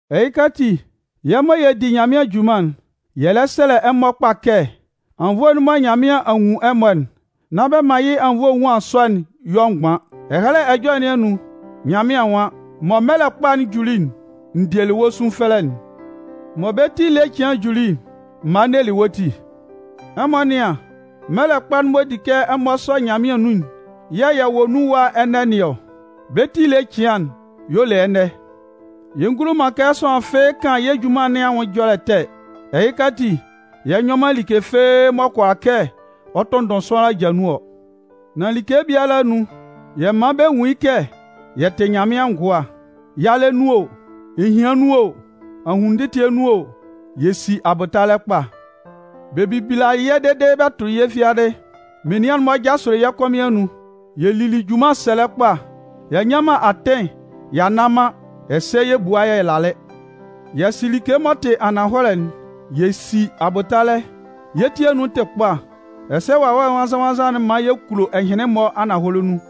Ɛhɩka ati, yɛ́ mɔ yɛ di Nyanmɩan junman'n, yɛ lɛ sɛlɛ ɛmɔ kpa kɛ anwunnvoe'n mɔ Nyanmɩan a nwun ɛmɔ'n, nán bɛ man yɩ́ anwunnvoe enwuan sɔ'n yɔ mgban. Ɛhɛlɛ Ɛjɔlɛ nɩn anun, Nyanmɩan nwan: Mɔ mɛlɛ kpa'n juli'n, n dielɩ wɔ́ sunfɛlɛ'n. Mɔ bɛ́ ti ele cɩan'n juli'n, m malɩ n nelɩ wɔ́ ti. Ɛmɔ nɩ́an, mɛlɛ kpa'n m'ɔ di kɛ ɛmɔ sɔ Nyanmɩan nun'n yɛ̂ yɛ wɔ nun ɛwa ɛnɛ nɩn ɔ. Bɛ́ ti ele cɩan'n, y'ɔ le ɛnɛ. Yɛ ngulo man kɛ sʋanlan fɩ́ɩ́ kan yɛ́ junman nɩn anwʋn ɛjɔlɛ ɛtɛ. Ɛhɩka ati, yɛ nyɔ man like fɩ́ɩ́ m'ɔ kʋala kɛ ɔ tʋnndʋn sʋanlan aja nun ɔ. Nan like biala anun, yɛ man bɛ nwun yɩ́ kɛ yɛ tɩ Nyanmɩan ngʋa. Yalɛ nun o, ehian nun o, ahunnun ndɩtɩɛ nun o, yɛ si abʋtalɛ kpa. Bɛ bilalɩ yɛ́ dede bɛ tʋlɩ yɛ́ fiadɩ. Menian'n-mɔ jasʋlɩ yɛ́ kɔmɩn anun, yɛ lili junman sɛlɛ kpa. Y'a nnyan man atɩn y'a nna man ɛsɛ yɛ bualɩ yɛ lalɩ. Yɛ sɩ like m'ɔ tɩ ananhɔlɛ'n, yɛ si abʋtalɛ, yɛ́ ti anun tɩ kpa, ɛsɛ Wawɛ Nwannzan-nwannzan'n man yɛ kulo ɛhɩnlɩn-mɔ ananhɔlɛ nun.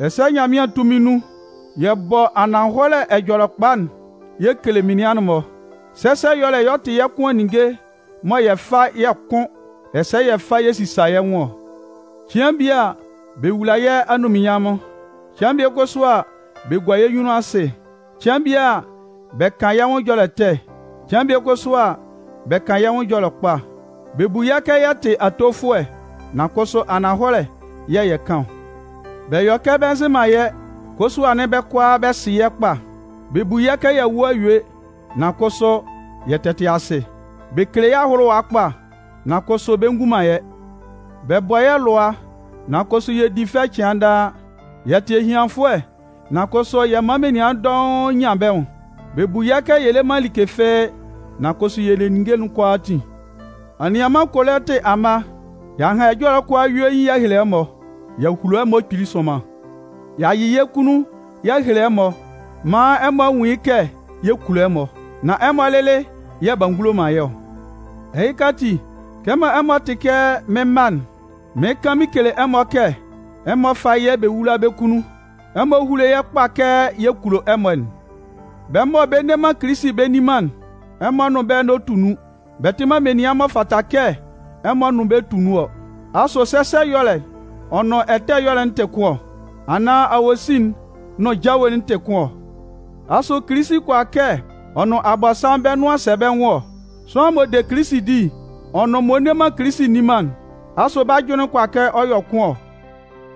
Ɛsɛ Nyanmɩan tunmin nun, yɛ bɔ ananhɔlɛ Ɛjɔlɛkpa'n yɛ kele menian'n-mɔ. Sɛsɛ ɛyɔlɛ'n y'ɔ tɩ yɛ́ kʋan ninnge mɔ yɛ fa yɛ kʋn ɛsɛ yɛ fa yɛ sisa yɛ́ nwʋn ɔ. Cɩan bie a, bɛ wula yɛ́ anunminnyanmʋn, cɩan bie kʋsʋ a, bɛ gua yɛ́ nyunnun asɩ. Cɩan bie a, bɛ kan yɛ́ nwʋn ɛjɔlɛ ɛtɛ, cɩan bie kʋsʋ a, bɛ kan yɛ́ nwʋn ɛjɔlɛ kpa. Bɛ bu yɛ́ kɛ yɛ tɩ atofʋɛ, nan kʋsʋ ananhɔlɛ yɛ̂ yɛ kan ɔ. Bɛ yɔ kɛ bɛ nzɩ man yɛ́, kʋsʋ anɩn bɛ́ kʋalaa bɛ sɩ yɛ́ kpa. Bɛ bu kɛ y'a wu a yue, nan kʋsʋ, yɛ tɛ tɩ asɩ. Bɛ kele yɛ́ ahʋlʋwa kpa, nan kʋsʋ bɛ ngun man yɛ́. Bɛ bɔ yɛ́ lʋa nan kʋsʋ yɛ di fɛ cɩan daa. Yɛ tɩ ehianfʋɛ, nan kʋsʋ yɛ man menian dɔʋn nyan bɛ́ nwʋn. Bɛ bu kɛ yɛ le man like fɩ́ɩ́ nan kʋsʋ yɛ le ninnge'n kʋalaatin. Anianman Kolɩntɩ amma, y'a han ɛjɔlɛ'n kʋalaa yuein y'a hele ɛmɔ. Y'a hulo ɛmɔ kpili sʋnman. Y'a yɩ yɛ́ kunnun y'a hele ɛmɔ maan ɛmɔ a nwun yɩ́ kɛ yɛ kulo ɛmɔ, nan ɛmɔ lɩlɩ yɛ̂ b'a ngulo man yɛ́ ɔ. Ɛhɩka ati, kɛmɔ ɛmɔ tɩ kɛ mɩ́n mma'n, mɩɩn kan mɩn kele ɛmɔ kɛ ɛmɔ fá yɛ́ bɛ wúla bɛ́ kunnun, ɛmɔ húlo yɛ́ kpa kɛ yɛ kulo ɛmɔ'n. Bɛ́ mɔ bɛ nne man Kilisi bɛ nni man'n, ɛmɔ nʋn bɛ́ n'ɔ tu nun. Bɛ tɩ man menian m'ɔ fata kɛ ɛmɔ nʋn bɛ́ tu nun ɔ. Asʋ sɛsɛ ɛyɔlɛ'n ɔ nʋn ɛtɛ ɛyɔlɛ'n tɩ kʋn ɔ? Anaan awosin'n nʋn jawe'n tɩ kʋn ɔ? Asʋ Kilisi kʋala kɛ ɔ nʋn Abɔnsanmʋn bɛ́ nʋan sɛ bɛ́ nwʋn ɔ? Sʋanlan m'ɔ de Kilisi di'n, ɔ nʋn m'ɔ nne man Kilisi nni man'n, asʋ bɛ́ ajʋnlɩn kʋala kɛ ɔ yɔ kʋn ɔ?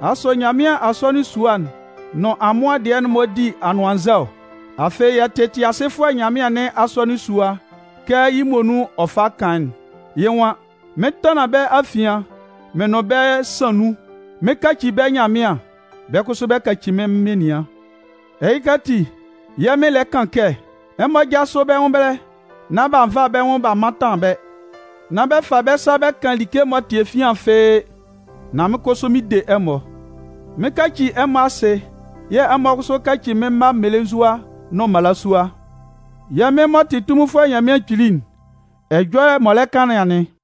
Asʋ Nyanmɩan asɔnɩn sua'n nʋn amʋan'n-mɔ di anʋannzɛ ɔ? Afɩ yɛ tɩ Tɩasɩfʋɛ Nyanmɩan nɩn asɔnɩn sua kɛ yɩ́ muonun ɔ fa kan'n. Yɩ́ nwan: Mɩn 'tanlan bɛ́ afian, mɩn nʋn bɛ́ yɛ san nun, mɩn 'kaci bɛ́ Nyanmɩan, bɛ́ kʋsʋ bɛ 'kaci mɩ́n menian. Ɛhɩka ati, yɛ́ Mɩn lɛ kan kɛ: Ɛmɔ jásʋ bɛ́ nwʋn ɛbɛlɛ, nán bɛ fa bɛ́ nwʋn bɛ mantan bɛ́. Nán bɛ fa bɛ́ sa bɛ kan like m'ɔ tɩ efian fɩ́ɩ́, nan mɩ́n kʋsʋ mɩn 'de ɛmɔ. Mɩn 'kaci ɛmɔ asɩ yɛ̂ ɛmɔ kʋsʋ 'kaci mɩ́n mma mmelenzua nʋn mmalasua. Yɛ́ Mɩn m'ɔ tɩ Tunminfʋɛ Nyanmɩan Kpili'n, ɛjɔlɛ m'ɔ lɛ kan nɩn anɩn.